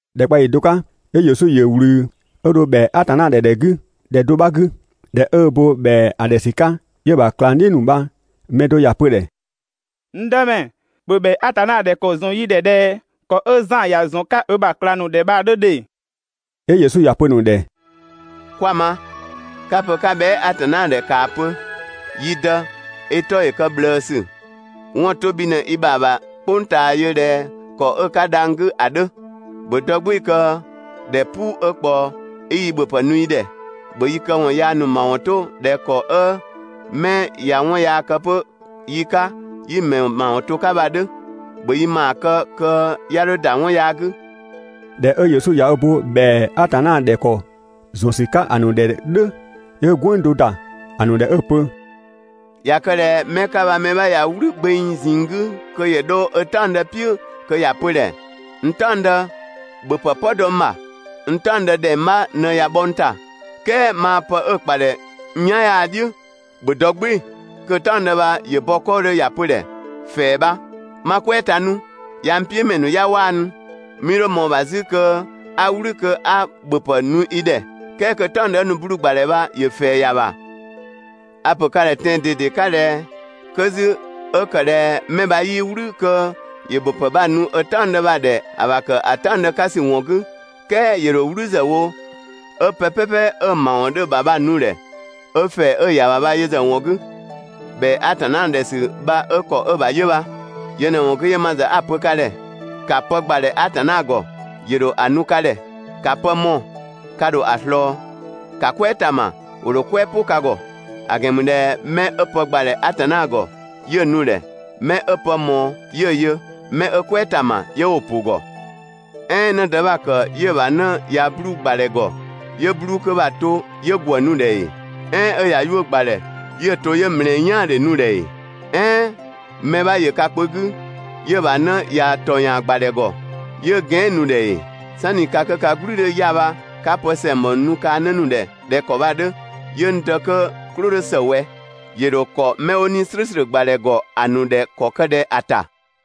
‑Dhɛkpaɔyi do 'ka, 'yö Yesu ‑yö ꞊wlü 'ö dho ‑bhɛa Atanna ‑dhɛ ‑dhɛ 'gü ‑dhɛ do 'bha 'gü. ꞊Dhɛ 'ö ö bo ‑bhɛa ‑a ‑dhɛ ‑sü 'ka, 'yö‑ ‑bha ꞊klangdhiʋ̈ ‑nu bha‑ mɛ do ‑ya pö‑ ‑dhɛ: «N Dëmɛ, ‑bhö ‑bhɛa Atanna ‑dhɛ ‑kɔ ‑zɔn yi ‑dhɛ ꞊dhɛ ‑kɔ 'ö Zan ‑ya ‑zɔn 'ka ö ‑bha ꞊klang ‑nu ‑dhɛ bha‑ 'dhö ‑dhe!» 'Yö Yesu ‑ya pö‑ ‑nu ‑dhɛ: «'Kwa‑ ma! 'ka‑ pö 'ka bhɛa" Atanna ‑dhɛ, ‑kaa pö: «Yi Dë, i 'tɔ ‑yö kë ꞊bhlëësü, 'wɔn‑ 'to bhi ꞊në i ‑bha ‑bha "kpʋng ꞊taa yö ꞊dhɛ ‑kɔ 'ö‑ 'ka dhang‑ 'gü ‑a 'dhö. ‑Bhö dɔ "gbɩɩ‑ kö ‑dhɛ "puu 'ö ꞊kpaɔ 'i yi ‑bhöpë nu yi ‑dhɛ. ‑Bhö yi këwɔn yaa ‑nu ‑mawɔn 'to ꞊dhɛ ‑kɔ 'ö mɛ ꞊ya 'wɔn yaa kë 'pö yi 'ka, 'yi‑ ‑mɛ ‑mawɔn to 'ka bha‑ 'dhö. ‑Bhö yi ‑maa kë kö 'ya 'dho ‑da 'wɔn yaa 'gü.» ꞊Dhɛ 'ö Yesu ꞊ya ö bo ‑bhɛa Atanna ‑dhɛ ‑kɔ ‑zɔn ‑sü 'ka ‑a ‑nu ‑dhɛ "dhʋ̈, 'yö‑ "gwënng do ‑da ‑nu ‑dhɛ 'ö‑ pö: «꞊Ya kë ꞊dhɛ 'mɛ 'ka bha mɛ 'bha ꞊ya "wlü gbeng ꞊zinng 'gü kö ‑yö 'dho ö "taɔngdë "piʋ̈ kö ‑ya pö‑ ‑dhɛ: «N "taɔngdë, ‑bhö ‑bhöpë "pɔ dɔ n ‑bha! N "taɔngdë ‑dhɛng 'bha ꞊në ꞊ya bhɔ n ‑ta, "kɛɛ maa pë 'ö‑ ‑kpa ‑dhɛ n "yan 'yaa‑ "dhiʋ̈, ‑bhö dɔ "gbɩɩ‑!» Kö‑ "taɔngdë bha ‑yö bɔ 'kɔɔdhö ‑ya pö‑ ‑dhɛ: «‑Fɛɛ bha! 'Ma "kwɛɛ ta 'nu, yaa‑ n "piʋ̈mɛ ‑nu 'ya 'waanu, 'mii 'dho ꞊mɔɔ‑ ‑bha 'zü kö 'a "wlü kö 'a ‑bhöpë nu i ‑dhɛ», "kɛɛ kö‑ "taɔngdë 'ö nu 'bluu‑ ‑gbadhɛ bha ‑yö ‑fɛɛ ‑ya ‑bha, a‑ ‑pö ka ‑dhɛ tɛan‑ ꞊dede 'ka ꞊dhɛ 'kö 'zü 'ö ‑kë ꞊dhɛ 'mɛ bha 'yii "wlü kö ‑yö ‑bhöpë bha‑ nu ö "taɔngdë bha‑ ‑dhɛ ‑a ‑bha ‑kë ‑a "taɔngdë 'ka ‑sü ‑wɔn 'gü, "kɛɛ ‑yö ‑dho "wlü zë wo 'ö pë "pɛpɛ 'ö‑ ‑mawɔn 'dhö‑ ‑bha bha‑ nu ‑dhɛ 'ö ‑fɛɛ 'ö‑ ‑ya ‑bha bha yö ‑zë ‑wɔn 'gü.» (‑Bhɛa Atanna ‑dhɛ ‑sü bha 'ö ‑kɔ 'ö‑ ‑bha 'yö bha.) Yö ꞊në‑ ‑wɔn 'gü, 'yö ma ‑zë 'a‑ pö ka ‑dhɛ: «‑Ka pë ‑gbadhɛ Atanna ‑gɔ, ‑yö ‑dho ‑a nu ka ‑dhɛ. ‑Ka pë mɔɔ‑, ka ‑dho ‑a ꞊slɔɔ. ‑Ka "kwɛɛ ‑ta ‑ma, ‑wo ‑dho "kwɛɛ "pʋ ka ‑gɔ. ‑A ‑gɛn ‑mü ꞊dhɛ 'mɛ 'ö pë ‑gbadhɛ Atanna ‑gɔ, 'yö‑ nu‑ ‑dhɛ, 'mɛ 'ö pë ꞊mɔɔ 'yö‑ yö, 'mɛ 'ö "kwɛɛ ‑ta ‑ma 'yö 'wo‑ ‑pʋ ‑gɔ. "Ɛɛn 'në dë 'bha‑ ‑kë 'yö‑ ‑bha 'në ꞊ya 'bluu‑ ‑gbadhɛ ‑gɔ, 'yö 'bluu‑ 'kö bha‑ to 'yö ‑gwë nu‑ ‑dhɛ ‑ee? "Ɛɛn 'ö ꞊ya 'yuʋ̈ga ‑gbadhɛ, 'yö‑ to 'yö ‑mlɛɛ "yaandhe nu‑ ‑dhɛ ‑ee? "Ɛɛn mɛ 'bha ‑yö ka kpö 'gü, 'yö‑ ‑bha 'në ꞊ya ‑tɔyaan ‑gbadhɛ ‑gɔ, 'yö gɛan" nu‑ ‑dhɛ ‑ee? "Sanni ka 'kö ka "gblü 'dhö 'ya‑ bha 'ka pë ‑sɛngbɔ ‑nu nu kaa‑ 'në ‑nu ‑dhɛ ꞊dhɛ ‑kɔ bha‑ 'dhö, 'yö n Dë 'kö‑ "klʋ 'dhö ‑së ꞊wɛ, ‑yö ‑dho ‑kɔ 'mɛ 'wo 'Nii‑ "slʋ̈ʋ̈slʋ̈ ‑gbadhɛ ‑gɔ ‑a ‑nu ‑dhɛ ‑kɔ kë ꞊dhɛ ‑a ‑ta?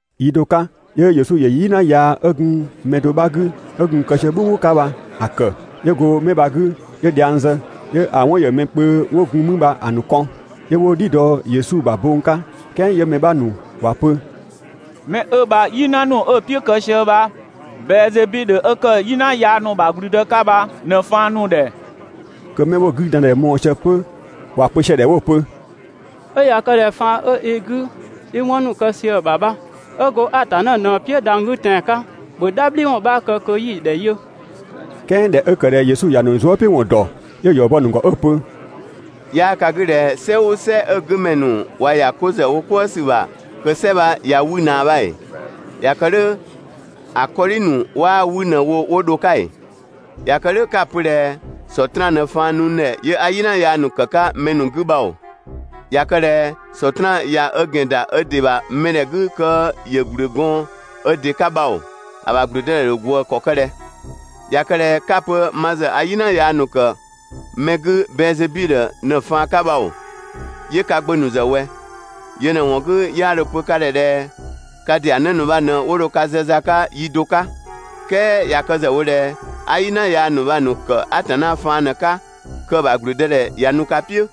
Yi do 'ka, 'yö Yesu ‑yö "yina yaa 'ö gun mɛ do 'bha 'gü 'ö gun‑ kë sië "bhʋbhʋ 'ka bha‑ ‑kë, 'yö go 'mɛ bha‑ 'gü 'yö dhiang zë. 'Yö‑ 'wɔn ‑yö mɛ kpö 'wo gun mü bha‑ ‑nu kɔn, 'yö 'wo "dhi dɔ Yesu ‑bha bong 'ka. "Kɛɛ 'yö mɛ 'bha ‑nu ‑wa pö: «'Mɛ 'ö bha "yina ‑nu 'ö‑ "piʋ̈ kë sië bha, Bɛɛzebidhö 'ö kë "yina yaa ‑nu ‑bha ‑gblüdë 'ka bha ꞊në‑ ‑faan nu‑ ‑dhɛ.» Kö 'mɛ 'wo‑ 'güdandhɛ mɔɔ‑ sië 'pö ‑wa pö sië‑ ‑dhɛ 'wo‑ pö: «'Ö ꞊ya kë ꞊dhɛ faan 'ö i 'gü 'i 'wɔn ‑nu kë sië‑ ‑bha bha 'ö go Atanna ꞊në‑ "piʋ̈ dhang‑ 'gü tɛan‑ 'ka, ‑bhö "dhabhliwɔn 'bha kë kö 'yi‑ ‑dhɛ yö!» "Kɛɛ ꞊dhɛ 'ö ‑kë ꞊dhɛ Yesu ‑ya ‑nu zuëpiʋ̈wɔn ‑dɔ, 'yö‑ ‑yɔ bɔ‑ ‑nu ‑gɔ 'ö‑ pö: «'Yaa ka 'gü ꞊dhɛ "sɛ "ʋʋ "sɛ 'ö‑ 'gümɛ ‑nu ꞊wa ‑ya 'ko ‑zë 'wo "kwëë ‑sü ‑bha, kö‑ "sɛ bha ꞊ya 'wü ꞊naa bha ‑ee? ꞊Ya kë "dhʋ̈ ‑a 'kɔdhi ‑nu 'waa 'wü ꞊në wo 'wo dho‑ 'ka ‑ee? ꞊Ya kë "dhʋ̈ 'ka‑ pö ꞊dhɛ Sɔtraan ꞊në faan nu n ‑dhɛ 'yö 'a "yina yaa ‑nu ‑kë 'ka mɛ ‑nu 'gü bha oo, ꞊ya kë ꞊dhɛ Sɔtraan ꞊ya ö ‑gɛn ‑da ö ‑dɩ ‑bha mɛdhɛ 'gü kö ‑yö ‑gblü gɔɔn ö ‑dɩ 'ka bha ‑oo, ‑a ‑bha ‑gblüdëdhɛ ‑dho ꞊gwëë ‑kɔ ‑kë ꞊dhɛ? ꞊Ya kë ꞊dhɛ 'ka‑ pö ma ‑zë a "yina ‑nu ‑kë mɛ 'gü Bɛɛzebidhö ꞊në‑ faan 'ka bha ‑oo, 'yö ka gbö ‑nu ‑zë ꞊wɛ? Yö ꞊në‑ ‑wɔn 'gü 'yö 'a dho‑ pö ka ‑dhɛ ꞊dhɛ ka ‑dɩa 'në ‑nu bha ꞊në 'wo dho ka zë za 'ka yi do 'ka. "Kɛɛ ꞊ya kë ‑zë wo ꞊dhɛ a "yina yaa ‑nu bha‑ ‑nu ‑kë Atanna faan ꞊në‑ 'ka, kö‑ ‑bha ‑gblüdëdhɛ ꞊ya nu ka "piʋ̈.»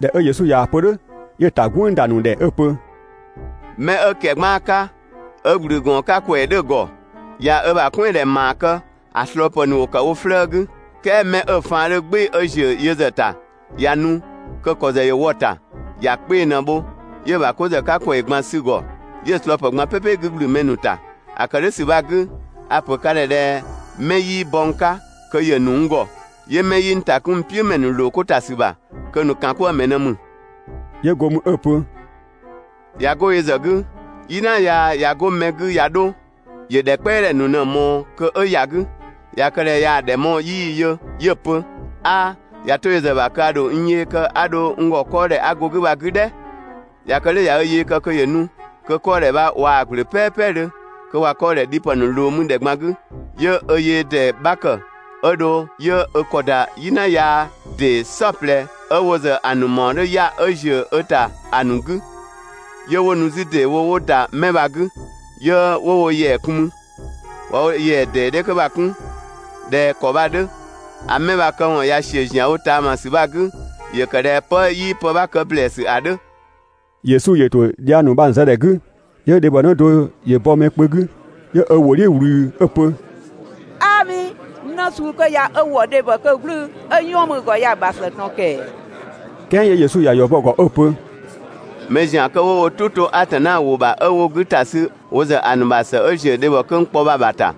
꞊Dhɛ 'ö Yesu ꞊yaa‑ pö "dhʋ̈, 'yö‑ ‑ta "gwënng ‑da ‑nu ‑dhɛ 'ö‑ pö: «'Mɛ 'ö ‑kɛgbaan 'ka, 'ö ‑gblü ‑gɔɔn 'ka ‑kwɛɛ 'dhö‑ ‑gɔ, ꞊ya ö ‑bha "kwɛandhɛ ‑maa kë, ‑a ꞊slɔɔpë ‑nu ‑wo ‑kë wo 'flëë‑ 'gü. "Kɛɛ 'mɛ 'ö‑ faan 'dhö "gbɩɩ‑ 'ö ‑ziö yö ‑zë ‑ta ꞊ya nu, kö‑ ‑kɔ ‑zë ‑yö wɔ‑ ‑ta, ‑ya 'kpee‑ ꞊në‑ bho, 'yö‑ ‑bha 'ko ‑zë 'ka ‑kwɛɛ ꞊gban sü‑ ‑gɔ 'yö‑ ꞊slɔɔpë ꞊gban "pɛpɛ 'gü ‑gblü mɛ ‑nu ‑ta. ‑A ‑kë "dhʋ̈ ‑sü bha‑ 'gü, a‑ ‑pö ka ‑dhɛ ꞊dhɛ 'mɛ 'yii bɔ n 'ka kö ‑yö ‑nu n ‑gɔ, 'yö 'mɛ 'yii n ‑ta 'kun n "piʋ̈ ‑mɛ ‑nu ‑loo 'ko ‑ta ‑sü ‑bha, kö‑ ‑nu ‑kan 'kwëë‑ ‑mɛ ꞊në ‑mü.» 'Yö go mü 'ö‑ pö: «꞊Ya 'go yö ‑zë 'gü, "yina yaa ꞊ya 'go mɛ 'gü ꞊ya 'dho, ‑yö ‑dhɛ "kpɛadhɛ ‑nu ꞊në‑ ꞊mɔɔ kö 'ö ‑ya 'gü. ꞊Ya kë ꞊dhɛ ꞊yaa‑ ‑dhɛ mɔɔ‑ 'yii‑ yö 'yö‑ pö: «'A, ꞊ya 'to yö ‑zë ‑bha kö a ‑dho n yee kë 'a dho n ‑gɔ 'kɔɔdhɛ 'a go‑ ‑bha bha‑ 'gü "dhɛ.» ꞊Ya kë "dhʋ̈ ꞊ya ö yee kë kö ‑yö nu, kö 'kɔɔdhɛ bha ꞊waa‑ ‑gblö "pɛɛpɛdhö, kö ꞊wa 'kɔɔdhɛ dhipë ‑nu ꞊loo mü ‑dhɛ ꞊gban 'gü, 'yö ö yee ‑dee 'bha ‑kë 'ö dho 'yö ö ‑kɔ ‑da "yina yaa ‑dee "saɔplɛ 'ö wo ‑zë ‑a ‑nu ‑mawɔn 'dhö 'ya‑ 'ö ‑ziö ö ‑ta ‑a ‑nu 'gü, 'yö 'wo nu 'zü ‑deewo 'wo ‑da 'mɛ bha‑ 'gü, 'yö 'wo wo ‑yɛa kun mü. ꞊Wa wo ‑yɛa ‑dee 'dhɛ 'kö bha‑ 'kun ꞊dhɛ ‑kɔ bha‑ 'dhö, ‑a 'mɛ bha‑ këwɔn ꞊ya ‑siö ‑zianwo ꞊taamasü bha‑ 'gü, ‑yö kë ꞊dhɛ 'pë 'yii pë 'bha kë ‑blɛɛsü ‑a 'dhö. Yesu ‑yö ‑to dhiang ‑nu bha‑ ‑nu zë ‑dhɛ 'gü, 'yö dhebhɔnë do ‑yö bɔ mɛ kpö 'gü 'yö ö ‑wʋ "dhiʋ̈ ꞊wlü 'ö‑ pö: «'Aami, 'në suu 'kö ya 'ö ‑wɔ dhebhɔ 'kö "gblʋ̈ʋ̈‑, 'ö 'yɔn mü‑ ‑gɔ ‑a ‑bha ‑së ꞊tɔn ‑kɛɛ!» "Kɛɛ 'yö Yesu ‑ya ‑yɔ bɔ 'ö‑ pö: «Mɛ ‑zian 'kö 'wo wo "tʋ 'to Atanna ‑wʋ ‑bha 'ö 'wo‑ 'gü ‑ta sü wo ‑zë ‑a ‑nu ‑bha ‑së 'ö ‑ziö dhebhɔ kö n kpɔ bha‑ ‑bha ‑ta!»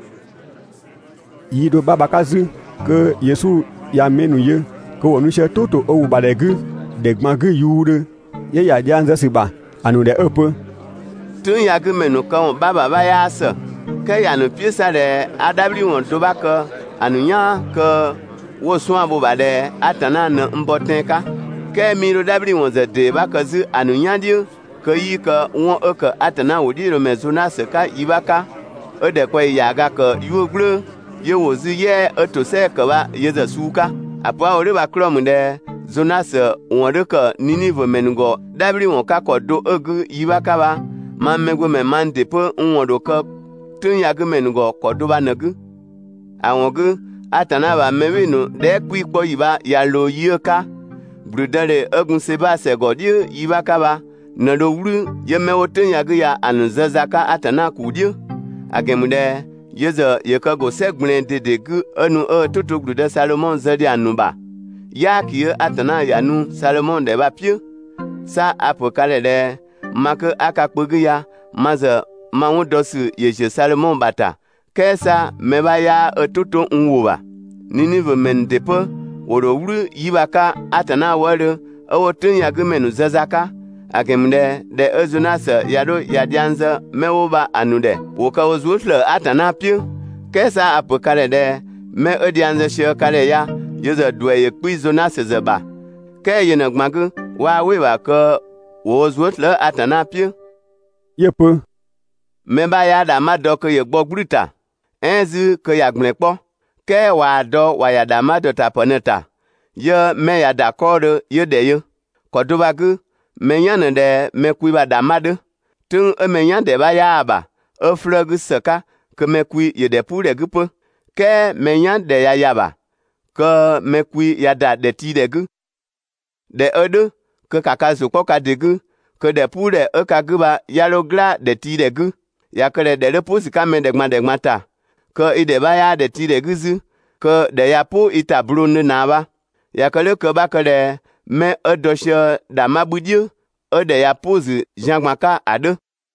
Yi do 'bha bha‑ 'ka 'zü, kö Yesu ꞊ya mɛ ‑nu yö kö ‑wo nu sië "tʋ ‑to ö ‑wʋ ‑bha ‑dhɛ 'gü ‑dhɛ ꞊gban 'gü yuudhö, 'yö ‑ya dhiang zë ‑sü ‑bha ‑a ‑nu ‑dhɛ 'ö‑ pö: «"Tʋ̈ng ya‑ 'gü ‑mɛ ‑nu këwɔn 'bha ‑bha 'bha 'yaa ‑së, "kɛɛ ‑ya ‑nu "piʋ̈ 'sa ꞊dhɛ 'a "dhabhliwɔn do 'bha kë ‑a ‑nu "yaan kö 'wo‑ 'suan‑ bho‑ ‑bha ꞊dhɛ Atanna ꞊në n bɔ tɛan‑ 'ka. "Kɛɛ 'mii 'dho "dhabhliwɔn ‑zë ‑dee 'bha kë 'zü ‑a ‑nu "yan "dhiʋ̈ kö 'yii kë 'wɔn 'ö ‑kë Atanna ‑wʋdhiʋ̈loomɛ Zonasö 'ka yi 'bha 'ka, ('ö ‑dhɛkpaɔyi ‑yaaga ‑kë 'yuʋ̈‑ "gblʋ̈ʋ̈‑ 'yö ‑wo 'zü "yɛa‑ 'ö ‑tosɛa ‑kë bha yö ‑zë suu 'ka). ‑A pö 'a‑ wo "dhʋ̈ bha‑ 'klɔɔ‑ ‑mü ꞊dhɛ Zonasö ‑wɔn 'dhö ‑kë Ninivö ‑mɛ ‑nu ‑gɔ "dhabhliwɔn 'ka ‑kɔ do 'ö‑ 'gü yi 'bha 'ka bha, mang Mɛgbömɛ mang ‑dɩ 'pö n ‑wɔn ‑dho kë "tʋ̈ng ya‑ 'gü ‑mɛ ‑nu ‑gɔ ‑kɔ do bha ꞊në‑ 'gü. ‑A ‑wɔn 'gü, Atanna ‑bha mɛ "bhɩɩ‑ ‑nu dhɛɛ" 'kpii‑ 'kpɔ ‑yi bha ꞊ya ꞊loo yi 'ö‑ 'ka, ‑gblüdëdhe 'ö gun Seba ‑sɛ ‑gɔ "dhiʋ̈ yi 'bha 'ka bha ꞊në dho "wlü 'yö 'mɛ 'wo "tʋ̈ng ya‑ 'gü bha‑ ‑nu zë za 'ka Atanna ‑kuu "dhiʋ̈; ‑a ‑gɛn ‑mü ꞊dhɛ yö ‑zë ‑yö kë ‑go "sɛ ꞊gblɛɛn ꞊dede 'gü 'ö nu 'ö ö "tʋ to (‑gblüdë) Sadhomɔ zë ‑dhiang ‑nu ‑bha, "yaaki 'ö Atanna ‑ya nu Sadhomɔ ‑dhɛ bha‑ "piʋ̈, 'sa a‑ ‑pö ka ‑dhɛ ꞊dhɛ ma 'kö a ka kpö 'gü ya, (ma ‑zë ma 'wɔn dɔ ‑sü ‑yö ‑ziö Sadhomɔ ‑bha ‑ta, "kɛɛ 'sa mɛ 'bha 'yaa ö "tʋ to n ‑wʋ ‑bha). Ninivö ‑mɛ ‑nu ‑dɩ 'pö ‑wo ‑dho "wlü 'yi bha‑ 'ka Atanna wëëdhö, 'ö 'wo "tʋ̈ng ya‑ 'gü ‑mɛ ‑nu zë za 'ka; ‑a ‑gɛn ‑mü ꞊dhɛ ꞊dhɛ 'ö Zonasö ꞊ya 'dho ꞊ya dhiang zë 'mɛ 'wo bha‑ ‑nu ‑dhɛ ‑wo kë wo zuë" ‑slëë Atanna "piʋ̈. "Kɛɛ 'sa a‑ ‑pö ka ‑dhɛ ꞊dhɛ 'mɛ 'ö dhiang zë sië ka ‑dhɛ ya, yö ‑zë ‑duɛ ‑yö 'kpii‑ Zonasö ‑zë ‑bha ("kɛɛ yö ꞊në‑ ꞊gban 'gü 'waa "wɩ‑ ‑bha kö ‑wo wo zuë" slëë‑ Atanna "piʋ̈).» 'Yö‑ pö: «Mɛ 'bha 'yaa ‑dhangbha dɔ kö ‑yö gbɔ ‑gblü ‑ta, "ɛɛn 'zü kö ‑ya ‑gblɛn 'kpɔ, "kɛɛ ꞊waa‑ dɔ ‑wa ‑ya ‑dhangbha ‑dɔtapë ꞊në‑ ‑ta, 'yö 'mɛ ꞊ya ‑da 'kɔɔdhö 'yö ‑dhɛ yö. ‑Kɔ do bha‑ 'gü, mɛ "yan ꞊në ꞊dhɛ mɛ kwi ‑bha ‑dhangbha 'dhö. "Tʋ̈ng 'ö mɛ "yan ‑dhɛ 'bha 'yaa‑ ‑bha, 'ö 'flëë‑ 'gü ‑së 'ka kö mɛ kwi ‑yö ‑dhɛpuudhɛ 'gü 'pö. "Kɛɛ mɛ "yan ‑dhɛ ꞊ya ‑ya ‑bha kö mɛ kwi ꞊ya ‑da ‑dhɛtiidhɛ 'gü. ꞊Dhɛ 'ö "dhʋ̈ kö ‑ka ka ‑zʋ 'kpɔ ka ‑dɩ 'gü kö ‑dhɛpuudhɛ 'ö ka 'gü bha 'ya 'dho "gla ‑dhɛtiidhɛ 'gü. ꞊Ya kë ꞊dhɛ ‑dhɛ 'dhö "pʋ ‑sü 'ka mɛ ‑dhɛ ꞊gban ‑dhɛ ꞊gban ‑ta, kö i ‑dhɛ 'bha 'yaa ‑dhɛtiidhɛ 'gü 'zü, kö ‑dhɛ ꞊ya "pʋ i ‑ta blongdhö ꞊naa bha. ꞊Ya kë "dhʋ̈ kö 'bha kë ꞊dhɛ 'mɛ 'ö dɔ sië ‑dhangbha 'bhü "dhiʋ̈, 'ö ‑dhɛ ꞊ya "pʋ‑ ‑zü zian ꞊gban 'ka ‑a 'dhö.»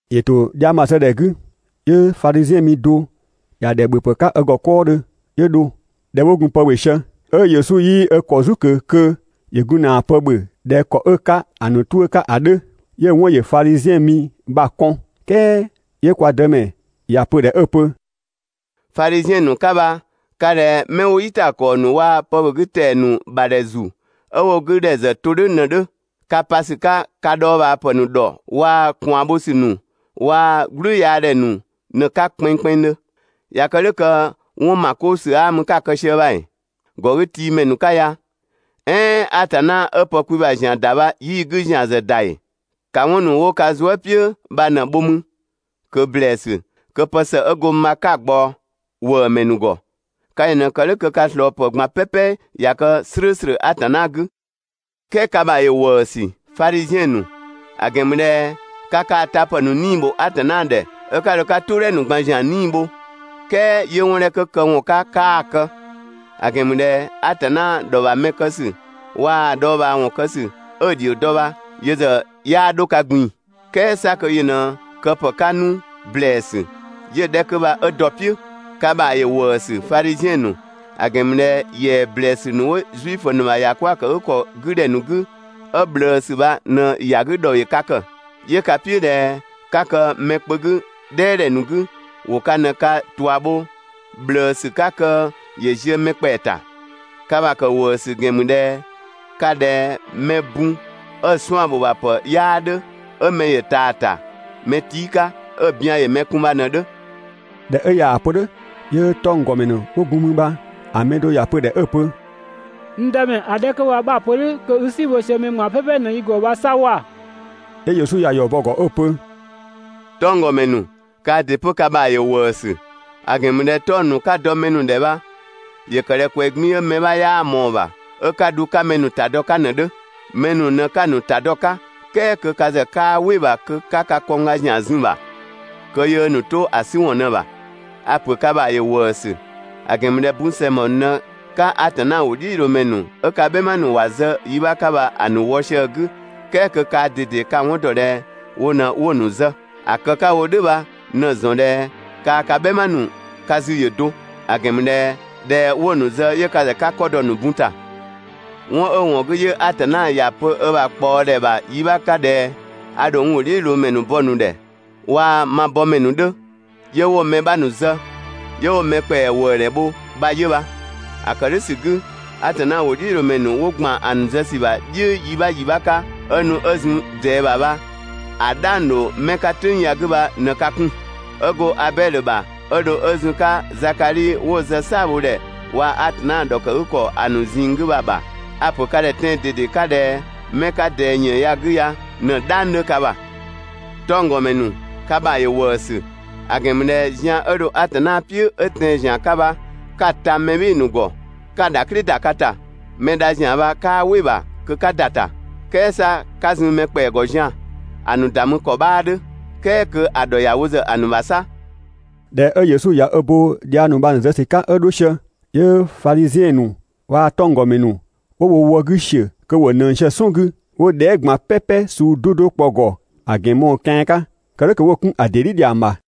‑Yö ‑to dhiang bha‑ zë ‑dhɛ 'gü, 'yö Fadhiziɛn mi do ‑ya ‑dhɛ ‑bhöpë 'ka ö ‑gɔ 'kɔɔdhö 'yö dho. ꞊Dhɛ 'wo gun pë ‑bhö sië, 'ö Yesu 'yii ö ‑kɔ "zu ꞊kö kö ‑yö gun ‑na pë ‑bhö ꞊dhɛ ‑kɔ 'ö‑ 'ka ‑a ‑nu 'tuʋ̈‑ 'ka ‑a 'dhö, 'yö‑ 'wɔn ‑yö Fadhiziɛn mi bha‑ kɔn. "Kɛɛ 'yö kwa Dëmɛ ‑ya pö‑ ‑dhɛ 'ö‑ pö: «Fadhiziɛn ‑nu, 'ka bha ka ꞊dhɛ 'mɛ 'wo "yitakɔɔ ‑nu waa‑ pëbhögütɛa ‑nu ‑bha ‑dhɛ ‑zu 'ö 'wo‑ 'gü ‑dhɛ ‑zë to "dhʋ̈ ꞊në‑ 'dhö. Ka pa ‑sü 'ka ka dhɔɔbhaa ‑pë ‑nu ‑dhɔ waa‑ ꞊kwaan bho ‑sü ‑nu waa‑ "gblüyaadhɛ ‑nu ꞊në‑ 'ka kpɛnngkpɛnngdhö. ꞊Ya kë "dhʋ̈ kö 'wɔn ‑ma 'koo ‑sü 'aa mü 'ka kë‑ sië bha ‑ee? ‑Gɔgütiimɛ ‑nu 'ka ya! "Ɛɛn Atanna 'ö pë kwi ‑bha ‑zian ‑da bha 'yii‑ 'gü ‑zian ‑zë ‑da ‑ee? ‑Ka 'wɔn ‑nu 'wo ka zuë" "piʋ̈ bha ꞊në‑ bho 'mü ꞊kö ‑blɛɛsü kö pë ‑së 'ö go mü bha 'ka‑ ꞊gbaɔ ‑wëëmɛ ‑nu ‑gɔ. 'Ka yö ꞊në‑ kë "dhʋ̈ kö ka ꞊slɔɔpë ꞊gban "pɛpɛ ꞊ya kë "slʋ̈ʋ̈slʋ̈ Atanna 'gü. "Kɛɛ ka ‑bha ‑yö ‑wëësü, Fadhiziɛn ‑nu! ‑A ‑gɛn ‑mü ꞊dhɛ ka kaa‑ tapë ‑nu 'nii‑ bho Atanna ‑dhɛ 'ö 'ka dho 'ka "tʋʋdhɛ ‑nu ꞊gban ‑zian 'nii‑ bho, "kɛɛ 'yö 'wɔn 'dhɛ 'kö këwɔn 'ka 'kaa‑ kë; ‑a ‑gɛn ‑mü ꞊dhɛ Atanna ‑dhɔ ‑bha mɛ kë ‑sü waa‑ dhɔɔbhaawɔn kë ‑sü 'ö‑ ‑dhio dɔ bha, yö ‑zë 'yaa 'dho ka ꞊gbin‑. "Kɛɛ 'sa kö yö ꞊në këpë 'ka 'nu ‑blɛɛsü, 'yö‑ 'dhɛ 'kö bha 'ö dɔ‑ "piʋ̈. Ka ‑bha ‑yö ‑wëësü, Fadhiziɛn ‑nu! ‑A ‑gɛn ‑mü ꞊dhɛ ‑yɛa ‑blɛɛsü ‑nu 'wo Zuifö ‑nu ‑bha ‑yakwëëkëgükɔ 'gü ‑dhɛ ‑nu 'gü 'ö ꞊bhlëësü bha ꞊në ‑ya 'gü ‑dhɔ ‑yö ka ‑kë. 'Yö ka "piʋ̈ ꞊dhɛ 'ka kë mɛ kpö 'gü "dhɛɛdhɛ ‑nu 'gü, ‑wo ka ꞊në ka ꞊tua bho ꞊bhlëësü 'ka kö ‑yö ziö mɛ ‑kpɛa ‑ta. Ka ‑bha ‑kë ‑wëësü ‑gɛn ‑mü ꞊dhɛ ka ꞊dhɛ mɛ bun 'ö‑ 'suan‑ ‑bho ‑bha ‑pë 'yaa 'dhö, 'ö mɛ ‑yö ꞊taa‑ ‑ta mɛ tii' 'ka, 'ö‑ bian ‑yö mɛ kun bha ꞊në‑ 'dhö.» ꞊Dhɛ 'ö ꞊yaa‑ pö "dhʋ̈, 'yö 'tɔnggɔmɛ ‑nu 'wo gun mü bha‑ mɛ do ‑ya pö‑ ‑dhɛ 'ö‑ pö: «N Dëmɛ, ‑a 'dhɛ 'kö bha 'bha‑ pö "dhʋ̈ kö i "si bho sië mɛ ꞊gban "pɛpɛ ꞊në yi ‑gɔ bha 'sa ‑wa!» 'Yö Yesu ‑ya ‑yɔ bɔ‑ ‑gɔ 'ö‑ pö: «'Tɔnggɔmɛ ‑nu, kaa ‑dɩ 'pö ka ‑bha ‑yö ‑wëësü; ‑a ‑gɛn ‑mü ꞊dhɛ 'tɔng‑ ‑nu 'ka‑ dɔ mɛ ‑nu ‑dhɛ bha ‑yö ‑kë ꞊dhɛ ꞊kwɛɛ‑ 'gbiin‑ 'ö mɛ 'bha 'yaa ꞊mɔɔ‑ ‑bha 'ö 'ka‑ dhu 'ka mɛ ‑nu dɔ‑ 'ka ꞊në‑ 'dhö. Mɛ ‑nu ꞊në 'ka‑ ‑nu ‑ta dɔ‑ 'ka, "kɛɛ kö ka ‑zë 'kaa "wɩ‑ ‑bha kö 'ka ka kɔngga ‑zian zun‑ ‑bha kö yöö ‑nu to‑ 'sü ‑wɔn ꞊në‑ ‑bha. A‑ ‑pö ka ‑bha ‑yö ‑wëësü, ‑a ‑gɛn ‑mü ꞊dhɛ bun ‑sɛngbɔ ‑nu ꞊në 'ka Atanna ‑wʋdhiʋ̈loomɛ ‑nu 'ö ka "bhɛma ‑nu ‑wa zë yi 'bha 'ka bha‑ ‑nu ‑wɔ sië‑ 'gü, "kɛɛ kö kaa ꞊dede ka‑ 'wɔn ‑dɔ ꞊dhɛ wo ꞊në 'wo‑ ‑nu zë. ‑A kë 'ka‑ wo "dhʋ̈ bha ꞊në‑ ‑zɔn ꞊dhɛ kaa‑ ka "bhɛma ‑nu ka zü ‑yö do, ‑a ‑gɛn ‑mü ꞊dhɛ ꞊dhɛ 'wo‑ ‑nu zë 'yö ka ‑zë 'ka 'kɔ dɔ‑ ‑nu bun ‑ta. 'Wɔn 'ö‑ ‑wɔn 'gü 'yö Atanna ‑ya pö ö ‑bha ꞊kpaɔdhɛ ‑bha yi 'bha 'ka ꞊dhɛ: ‹A ‑dho n ‑wʋdhiʋ̈loomɛ ‑nu bɔ‑ ‑nu ‑dhɛ, waa‑ ma bɔmɛ ‑nu 'dhö, 'yö 'wo‑ mɛ 'bha ‑nu zë, 'yö 'wo‑ mɛ ‑kpɛa ‑wëëdhɛ bho› bha 'yö bha. ‑A ‑kë "dhʋ̈ ‑sü 'gü, Atanna ‑wʋdhiʋ̈loomɛ ‑nu 'wo ‑gban ‑a ‑nu zë ‑sü bha "dhʋ̈ yi 'bha ‑yi 'bha 'ka 'ö nu 'ö zun ꞊dɛɛ ‑bha bha, ‑a "dhang ‑dho 'mɛ 'ka "tʋ̈ng ya‑ 'gü bha ꞊në ka 'kun. 'Ö go Abɛdhö ‑bha 'ö dho 'ö zun‑ 'ka Zakadhi 'wo‑ zë "saabhodhɛ waa‑ Atanna ‑dhɔkëgükɔ ‑a ‑nu ꞊zinng 'gü bha‑ ‑bha, a‑ ‑pö ka ‑dhɛ tɛan‑ ꞊dede 'ka ꞊dhɛ 'mɛ 'ka ꞊dɛɛ ‑yën ya‑ 'gü ya ꞊në‑ "dhang 'dhö ka ‑bha. 'Tɔngdɔmɛ ‑nu, ka ‑bha ‑yö ‑wëësü, ‑a ‑gɛn ‑mü ꞊dhɛ zian 'ö dho Atanna "piʋ̈ 'ö tɛan‑ ‑zian 'ka bha, 'ka‑ ta mɛ "bhɩɩ‑ ‑nu ‑gɔ 'ka‑ ‑dhaklɩ ‑da ka ‑ta. Mɛ dha ‑zian bha 'kaa "wɩ‑ ‑bha kö 'ka ‑da ‑ta, "kɛɛ 'sa 'ka zun mɛ ‑kpɛa ‑gɔ zian‑, ‑a ‑nu ‑da mü ‑kɔ 'bhaa 'dhö, "kɛɛ kö ‑a ‑dhɔ ‑ya wo ‑zë ‑a ‑nu ‑bha 'sa.» ꞊Dhɛ 'ö Yesu ꞊ya ö bo dhiang ‑nu bha‑ ‑nu zë ‑sü 'ka 'ö 'dho sië, 'yö Fadhiziɛn ‑nu waa‑ 'tɔnggɔmɛ ‑nu 'wo wo wë 'gü ‑siö kö ‑wo ꞊nëng sië‑ "sɔn 'gü 'wo dhɛɛ" ꞊gban "pɛpɛ suu 'do 'do kpɔ‑ ‑gɔ ‑a ‑gɛn mɔɔ‑ kian 'ka, kë "dhʋ̈ kö 'wo‑ 'kun‑ ‑dɩ "dhi ‑dhiang ‑bha.